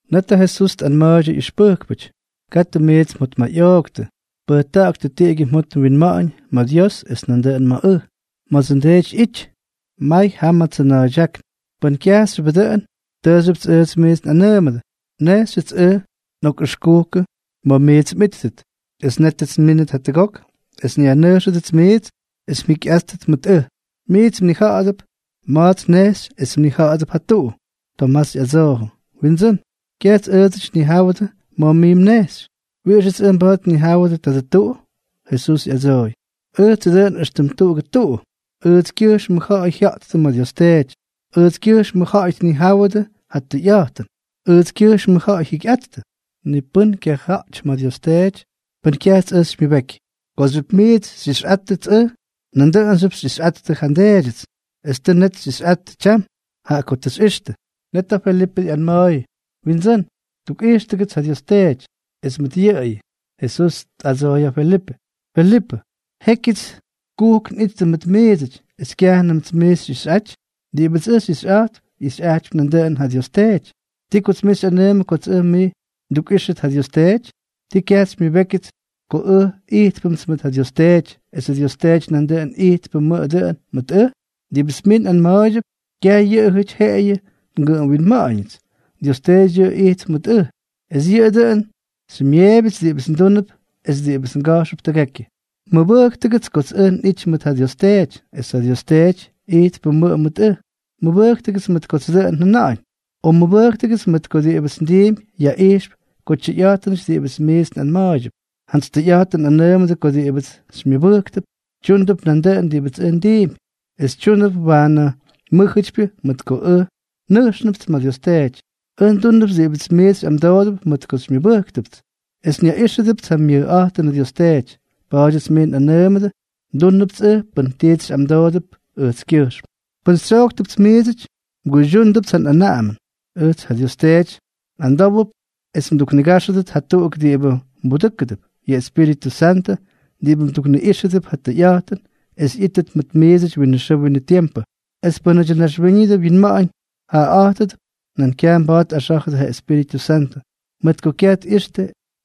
Net ja Jesús tꞌanma̱a̱ydyʉ ꞌyʉxpʉjkpʉty: —Katʉ miits mjotmayꞌooktʉ. Pʉjta̱ꞌa̱ktʉ tiꞌigyʉ mjot mwinma̱ꞌa̱ñ ma̱ Dios es nandʉꞌʉn ma̱ ʉj. Ma̱dsʉ nDeety ꞌyity, may jam ja tsʉna̱a̱ydyákn. Pʉn kyajxyʉbʉ dʉꞌʉn, tʉʉxyʉpts ʉj miits nꞌanʉʉmʉdʉ. Nnejxyʉts ʉj nꞌokꞌʉxkukʉ ma̱ miits mꞌíttʉt. Es nétʉts nmínʉt jatʉgok es nyajnʉjxtʉdʉts miits es mjikyꞌáttʉt mʉt ʉj. Miits mnija̱ꞌa̱dʉp ma̱ts nnejxy es mnija̱ꞌa̱dʉp ja tuꞌu. Tomás ꞌyadsoojʉ: —Windsʉ́n, kyajts ʉʉdsʉty nnijáwʉdʉ ma̱ mij mnejxy. ¿Wiꞌixʉts ʉj mba̱a̱t nnijáwʉdʉ tadʉ tuꞌu? Jesús ꞌyadsooy: —Ʉjtsʉ dʉꞌʉn éxtʉm tuꞌugʉ tuꞌu, ʉjtskyʉjxmʉ ja̱ꞌa̱y jya̱ꞌttʉ ma̱ Dios Teety, ʉjtskyʉjxmʉ ja̱ꞌa̱y tnijáwʉdʉ ja tʉyꞌa̱jtʉn, ʉjtskyʉjxmʉ ja̱ꞌa̱y jyikyꞌattʉ. Ni pʉ́n kyaja̱ꞌty ma̱ Dios Teety pʉn kyajts ʉj xymyʉbeky. Kooxyʉp miits xyꞌixyꞌáttʉts ʉj, nandʉꞌʉnxyʉp xyꞌixyꞌattʉ ja nDeedyʉts. Es tʉ net xyꞌixyꞌattʉ tyam, jaꞌa ko tʉ xyꞌixtʉ. Net ja Felipʉ ꞌyanma̱a̱yʉ: —Windsʉ́n, tukꞌijxtʉgʉts ja Dios Teety, es mʉt yʉꞌʉyʉ. Jesús tꞌadsooy ja Felipʉ: —Felipʉ, jékyʉts kujk nꞌittʉ mʉt miidsʉty, ¿es kyajnʉmts mij xyꞌixyꞌaty? Diꞌibʉts ʉj xyꞌixyꞌa̱jtp, ꞌyixyꞌajtypy nandʉꞌʉn ja Dios Teety. ¿Ti kots mij xyꞌanʉʉmʉ kots ʉj mij ndukꞌíxʉt ja Dios Teety? ¿Ti kyajts xymyʉbékyʉts ko ʉj ijtpʉmts mʉt ja Dios Teety, esʉ Dios Teety nandʉꞌʉn ijtpʉmʉ dʉꞌʉn mʉt ʉj? Diꞌibʉts miits nꞌanma̱a̱ydyʉp, kyaj yʉꞌʉjʉty jeꞌeyʉ ngʉꞌʉm winma̱ꞌa̱ñʉts. Dios Teety yʉꞌʉ ijtp mʉt ʉj, es yʉꞌʉ dʉn xymyeebyʉts diꞌibʉts ndúnʉp es diꞌibʉts nga̱jxʉp tʉgekyʉ. Mʉbʉjktʉgʉts kots ʉj nꞌity mʉt ja Dios Teety, es ja Dios Teety ijtpʉmʉꞌʉ mʉt ʉj. Mʉbʉjktʉgʉts mʉt kots dʉꞌʉn njʉna̱ꞌa̱ñ, o mʉbʉjktʉgʉts mʉt ko diꞌibʉts ndiimpy yaꞌijxp ko tyʉyꞌa̱jtʉnʉty diꞌibʉts miits nꞌanma̱a̱ydyʉp. ’Jantsy tʉyꞌa̱jtʉn nꞌanʉʉmʉdʉ ko diꞌibʉts xymyʉbʉjktʉp, tyúndʉp nandʉꞌʉn diꞌibʉts ʉj ndiimpy. Es tyúndʉp waanʉ mʉ́jʉtypyʉ mʉt ko ʉj nʉjxnʉpts ma̱ Dios Teety. Ʉj ndúnʉpts diꞌibʉts miits xyꞌamdoodʉp mʉt ko xymyʉbʉ́ktʉts, es dʉꞌʉn nyaꞌíxʉdʉpts ja myʉjꞌa̱jtʉnʉ Dios Teety. Pa̱a̱dyʉts miits nꞌanʉʉmʉdʉ, ndúnʉpts ʉj pʉn tits xyꞌamdoodʉp ʉjtskyʉjxm. ’Pʉn xytsyojktʉpts miidsʉty, mguydyúndʉpts ja nꞌanaꞌamʉn. Ʉjts ja Dios Teety nꞌamdówʉp es mduknigáxʉdʉt jatuꞌuk diꞌibʉ mbudʉ́kʉdʉp, yʉ Espíritʉ Santʉ diꞌibʉ mdukꞌíxʉdʉp ja tʉyꞌa̱jtʉn es ꞌyítʉt mʉt miidsʉty winʉ xʉʉ winʉ tiempʉ. Es pʉ́nʉdyʉ naxwíñʉdʉ winma̱ꞌa̱ñ jaꞌaꞌa̱jtʉdʉp, nan kyaj mba̱a̱t tꞌaxá̱jʉdʉ ja Espíritʉ Santʉ, mʉt ko kyaj tꞌixtʉ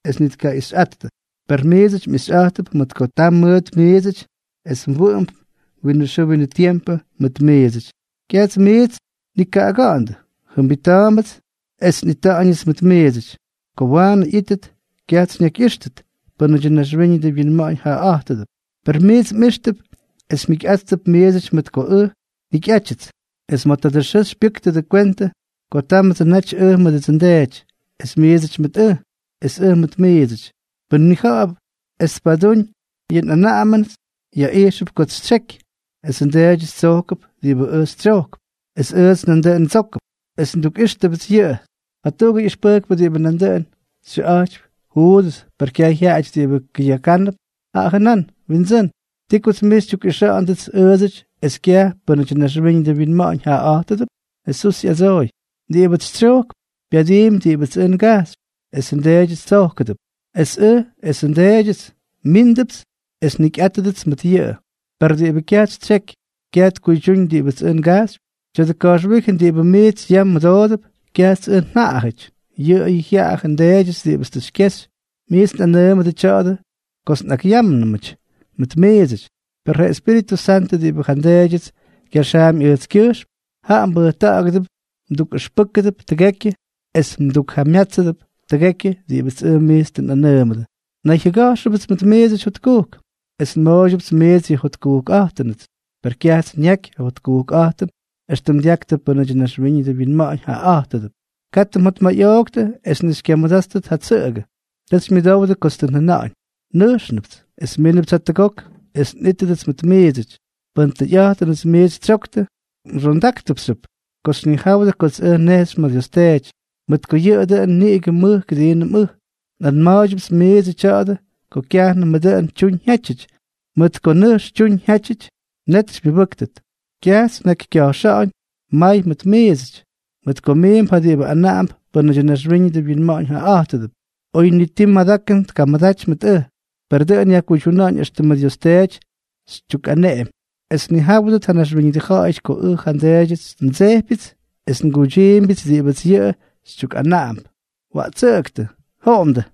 es ni tkaꞌixyꞌattʉ. Per miits mꞌixyꞌa̱jttʉp mʉt ko taa mʉt miidsʉty es wʉꞌʉmp winʉ xʉʉ winʉ tiempʉ mʉt miidsʉty. Kyajts miits nnikaꞌaga̱ꞌa̱ndʉ. Jʉmbita̱a̱mbʉts es nꞌita̱ꞌa̱ñʉts mʉt miidsʉty. Ko waanʉ ꞌyítʉt, kyajts xyñakyꞌíxtʉt pʉ́nʉdyʉ naxwíñʉdʉ winma̱ꞌa̱ñ jaꞌaꞌa̱jtʉdʉp, per miits mꞌíxtʉp, es mjikyꞌáttʉp miidsʉty mʉt ko ʉj njikyꞌátyʉts. Es ma̱ tadʉ xʉʉ xypyʉ́ktʉdʉ kwentʉ ko támʉdsʉ naty ʉj mʉdʉdsʉ nDeety, es miidsʉty mʉt ʉj, es ʉj mʉt miidsʉty. Pʉ́n ñija̱ꞌa̱p es tpadúñ yʉ nꞌanaꞌamʉnʉts, yaꞌijxʉp kots xytsyeky. Esʉ nDeedyʉts tsojkʉp diꞌibʉts ʉj xytsyojkp, es ʉjts nandʉꞌʉn ndsókʉpts, es ndukꞌíxʉpts yʉꞌʉ. Jatuꞌugʉ ꞌyʉxpʉjkpʉ diꞌibʉ nandʉꞌʉn xyʉꞌa̱jtypy Juudʉs, per kyaj jyaꞌajʉty diꞌibʉ kʉyakánʉp, jaꞌa jʉnán: —Windsʉ́n, ¿ti kots mij xytyukꞌixa̱ꞌa̱ndʉts ʉʉdsʉty es kyaj pʉ́nʉdyʉ naxwíñʉdʉ winma̱ꞌa̱ñ jaꞌaꞌa̱jtʉdʉp? Jesús ꞌyadsooy: —Diꞌibʉts xytsyojkp, pyadiimpy diꞌibʉts ʉj ngajxypy; esʉ nDeedyʉts tsókʉdʉp; es ʉj esʉ nDeedyʉts, míndʉpts es njikyꞌátʉdʉts mʉt yʉꞌʉ. Per diꞌibʉ kyajts xytsyeky, kyaj tkuydyúñ diꞌibʉts ʉj ngajxypy. Tya̱dʉ ka̱jxwíjʉn diꞌibʉ miits yam mʉdoodʉp, kyajts ʉj njaꞌajʉty, yʉꞌʉyʉ jyaꞌajʉ nDeedyʉts diꞌibʉts tʉ xykyexy. ’Miits nꞌakꞌanʉʉmʉdʉ tya̱a̱dʉ kots nꞌakꞌyámnʉmʉty mʉt miidsʉty. Per ja Espíritʉ Santʉ diꞌibʉ ja nDeedyʉts kyaxaampy ʉjtskyʉjxm, jaꞌa mbudʉ́kʉdʉp, mdukꞌʉxpʉ́kʉdʉp tʉgekyʉ es mdukjamyátsʉdʉp tʉgekyʉ diꞌibʉts ʉj miits tʉ nꞌanʉʉmʉdʉ. ’Nnayjyʉga̱jxʉpts mʉt miidsʉty jotkujk. Es nmooydyʉpts miits yʉ njotkujkꞌa̱jtʉnʉts. Per kyajts nyaky ja jotkujkꞌa̱jtʉn éxtʉm dyaktʉ pʉ́nʉdyʉ naxwíñʉdʉ winma̱ꞌa̱ñ jaꞌaꞌa̱jtʉdʉp. Katʉ mjotmayꞌooktʉ es ni xykyamʉdáttʉt ja tsʉꞌʉgʉ. Tʉ xymyʉdowdʉ kots tʉ njʉna̱ꞌa̱ñ: “Nʉjxnʉpts, es mínʉpts jatʉgok es nꞌítʉdʉts mʉt miidsʉty.” Pʉn tʉyꞌa̱jtʉnʉts miits xytsyoktʉ, mxondáktʉpxyʉp ko xyñijáwʉdʉ kots ʉj nnejxy ma̱ Dios Teety, mʉt ko yʉꞌʉ dʉꞌʉn niꞌigʉ mʉj kʉdiinʉm ʉj. ’Nꞌanma̱a̱ydyʉpts miidsʉ tya̱a̱dʉ ko kyajnʉmʉ dʉꞌʉn tyuñ jyátyʉty, mʉt ko nʉjx tyuñ jyátyʉty, net xymyʉbʉ́ktʉt. Kyajts nnakykya̱jxa̱ꞌa̱ñ may mʉt miidsʉty, mʉt ko miimp ja diꞌibʉ anaꞌamp pʉ́nʉdyʉ naxwíñʉdʉ winma̱ꞌa̱ñ jaꞌaꞌa̱jtʉdʉp, oy ni ti madakʉn tkamʉdaty mʉt ʉj. Per dʉꞌʉn yajkuydyuna̱ꞌa̱ñ éxtʉmʉ Dios Teety xytyukꞌaneꞌemy es tnijáwʉdʉt ja naxwíñʉdʉ ja̱ꞌa̱yʉty ko ʉj ja nDeedyʉts ndsejpyʉts es nguydyiimbyʉts diꞌibʉts yʉꞌʉ xytyukꞌanaꞌamp. Waꞌtsʉꞌʉktʉ. Joꞌomdʉ.